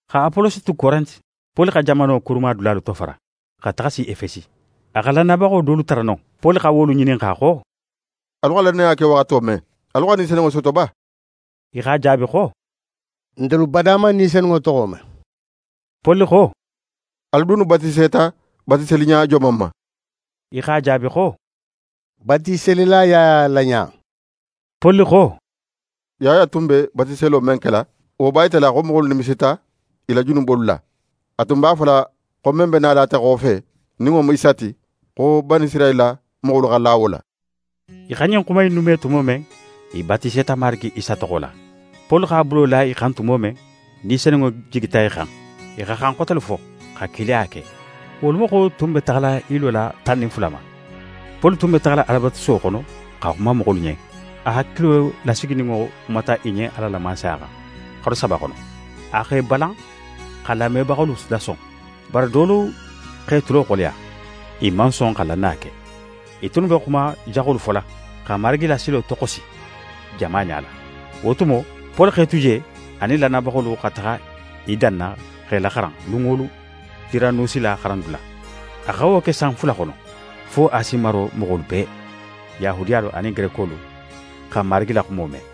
Xa Apolosi tu Korente, Poli xa jamano kurumadulalu tofara, xa taxa si Efesi. A xa lannayabaxo dolu tara non. Poli xa wolu ŋininxa xo: «Alu xa lannaya ke waxato men, alu xa Ni Senunŋo soto ba?» I x'a jaabi xo: «Ntelu bada man Ni Senunŋo toxo me.» Poli xo: «Alu dunnu batiseta batiseliɲa joman ma?» I x'a jaabi xo: «Batiselila Yaya la ɲa.» Poli xo: «Yaya tun be batiselo men kela, wo b'a yitala xo moxolu nimisita i la junubolu la. A tun b'a fola xo men be nala ate xofe, nin wo mu Isa ti, xo Banisirayila moxolu xa la wo la.» I xa ɲin xuma innu me tumo men, i batiseta Marigi Isa toxo la. Poli x'a bulo la i xan tumo men, Ni Senunŋo jigita i xan. I xa xan xotelu fo, xa kilaya ke. Wolu moxo tun be taxala i lola tan nin fula ma. Poli tun be taxala Alabatusuwo xono xa xuma moxolu ɲen. A hakilo lasigininŋo xumata i ɲen Ala la Mansaya xan, xaru saba xono. A x'e balan x'a lamebaxolu lason. Bari dolu x'e tulo xoleya, i man son xa lannaya ke. I tunnu be xuma jaxolu fola, xa Marigi la silo toxosi jama ɲala. Wo tumo, Poli x'e tu je, a nin lannayabaxolu xa taxa i danna x'e laxaran lun wo lun Tiranusi la xarandula. A xa wo ke san fula xono, fo Asi maro moxolu bee, Yahudiyalu anin Gerekolu, xa Marigi la xumo me.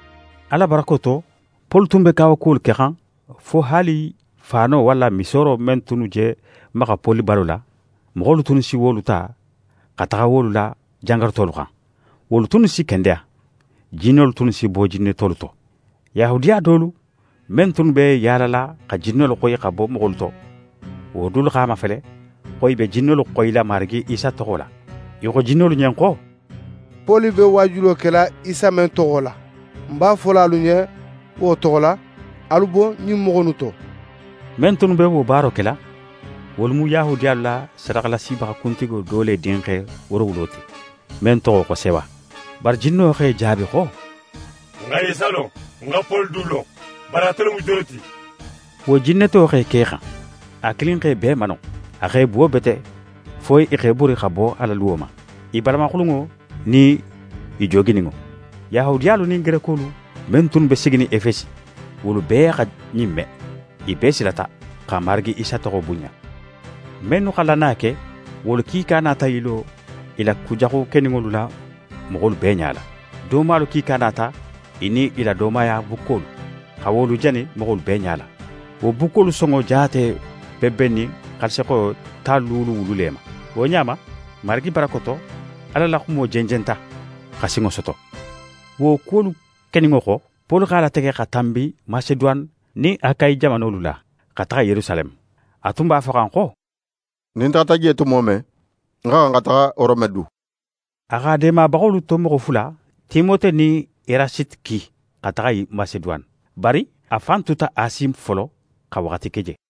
Ala barako to, Poli tun be kawakubalu kexan, fo haali faano walla misooro men tunnu je maxa Poli balo la, moxolu tunnu si wolu ta xa taxa wolu la jangarutolu xan. Wolu tunnu si kendeya, jinnolu tunnu si bo jinnetolu to. Yahudiya dolu, men tunnu b'e yaalala xa jinnolu xoyi xa bo moxolu to, wo dulu x'a mafele xo i be jinnolu xoyila Marigi Isa toxo la. I xo jinnolu ɲen xo: «Poli be waajulo kela Isa men toxo la, ń b'a fola alu ɲen wo toxo la, alu bo ɲin moxo innu to!» Men tunnu be wo baaro kela, wolu mu Yahudiyalu la sadaxalasibaxa kuntigo do le dinxe woorowulo ti, men toxo xo Sewa. Bari jinno x'e jaabi xo: «Ń xa Isa lon, ń xa Poli du lon, bari atelu mu jonnu ti?» Wo jinneto x'é ke i xan. A kilin x'e bee mano. A x'e buwo bete fo i x'e bori xa bo a la luwo ma, i balamaxulunŋo nin i joogininŋo. Yahudiyalu nin Gerekolu men tunnu be siginin Efesi, wolu bee xa ɲin me. I bee silata, xa Marigi Isa toxo bunɲa. Mennu xa lannaya ke, wolu kiika nata i lo i la kujaxu keninŋolu la moxolu bee ɲala. Doomalu kiika nata i nin i la doomaya bukkolu, xa wolu jani moxolu bee ɲala. Wo bukkolu sonŋo jaate be bennin xaalisixoyo tan luulu wulu le ma. Wo ɲa ma, Marigi barako to, Ala la xumo jenjenta, xa sinŋo soto. Wo kuwolu keninŋo xo, Poli x'a latege xa tanbi Maseduwane nin Akayi jamanolu la, xa taxa Yerusaleme. A tun b'a foxan xo: «Nin ń taxata je tumo men, ń xa xan xa taxa Rome du.» A x'a deemabaxolu to moxo fula, Timote nin Erasite ki xa taxa Maseduwane. Bari a fan tuta Asi folo xa waxati ke je.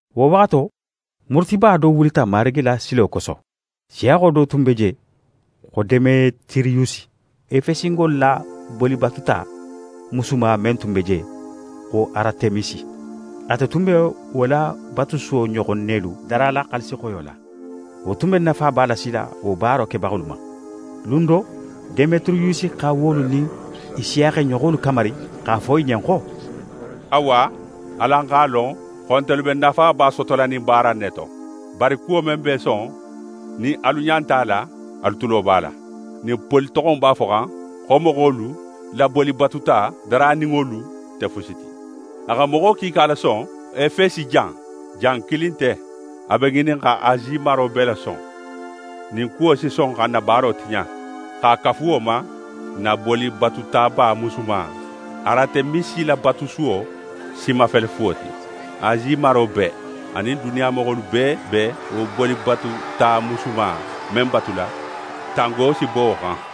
Wo waxato, murutiliba do wulita Marigi la silo koso. Siyaxo do tun be je xo Demetiriyusi. Efesingolu la bolibatuta musuma men tun be je xo Aratemisi, ate tun be wo la batusuwo ɲoxon nelu darala xaalisixoyo la. Wo tun be nafaba lasila wo baaro kebaxolu ma. Lun do, Demetiriyusi xa wolu nin i siyaxeɲoxolu kamari x'a fo i ɲen xo: «Awa, alu x'a lon xo ntelu be nafaba sotola ɲin baara in ne to. Bari kuwo men b'é son, nin alu ɲa nte a la, alu tulo b'a la. Ɲin Poli toxo in b'a foxan xo moxolu la bolibatuta daraninŋolu nte fusi ti. A xa moxo kiika lason Efesi jan. Jan kilin nte, a be ŋinin xa Asi maro bee lason. Ɲin kuwo si son xa n na baaro tiɲa. X'a kafu wo ma, n na bolibatutaba musuma Aratemisi la batusuwo si mafele fuwo ti. Asi maro bee, anin duniya moxolu bee be wo bolibatuta musuma in men batula, tango si bo wo xan.»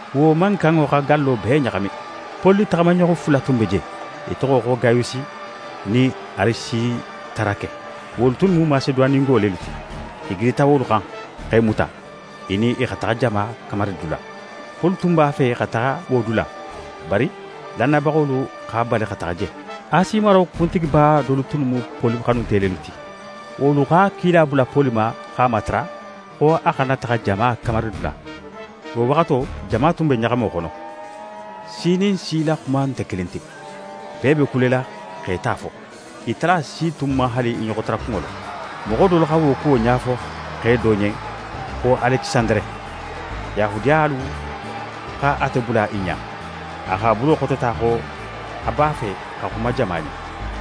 Wo mankanŋo xa gallo bee ɲaxami. Poli taxamaɲoxo fula tun be je. I toxo xo Gayusi nin Arisitarake, wolu tunnu mu Maseduwanengo lelu ti. I gidita wolu xan, x'e muta, i nin i xa taxa jama kamaridula. Poli tun b'a fe xa taxa wo dula, bari lannayabaxolu x'a bali xa taxa je. Asi maro kuntigiba dolu tunnu mu Poli xanunte lelu ti. Wolu xa kila bula Poli ma x'a matara xo a xana taxa jama kamaridula. Wo waxato, jama tun be ɲaxamo xono. Si nin si la xumo nte kilin ti. Bee be kulela x'e ta fo. I tala si tun man haali i ɲoxotara kunŋo lon. Moxo dolu xa wo kuwo ɲafo xe do ɲen xo Alekisandere. Yahudiyalu xa ate bula i ɲa. A x'a bulo xotota xo a b'a fe xa xuma jama ɲen.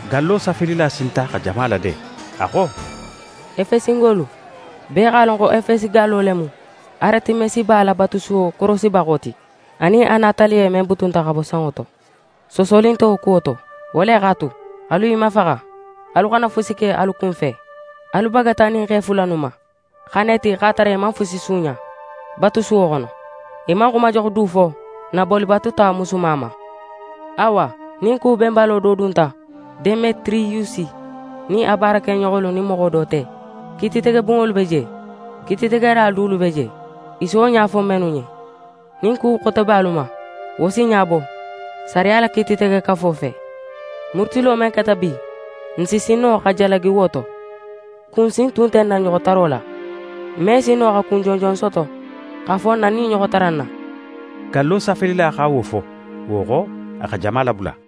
Gallo safelila sinta xa jama lade, a xo: «Efesingolu, bee x'a lon xo Efesi gallo le mu Aratemisiba la batusuwo korosibaxo ti anin a nataliye men butunta xa bo sanŋo to. Soosoli nte wo kuwo to. Wo le x'a tu, alu i mafaxa, alu xana fusi ke alu kunfe. Alu bagata ɲin xe fula innu ma, xa na i ti x'a tara i man fusi suuɲa batusuwo xono, i man xuma jaxu du fo n na bolibatuta musuma ma. Awa nin ku benbalo do dunta Demetiriyusi nin a baarakeɲoxolu nin moxo do te, kiititege bunŋolu be je, kiititegela dulu be je i si wo ɲa fo mennu ɲen. Nin ku xote be alu ma, wo si ɲabo sariya la kiititegekafo fe. Murutilo men keta bi, n si sin no xa jalagi wo to. Kun si tun nte n na ɲoxotaro la. N me sin no xa kun jonjon soto x'a fo n na ɲin ɲoxotara in na.» Gallo safelila xa wo fo, wo xo, a xa jama labula.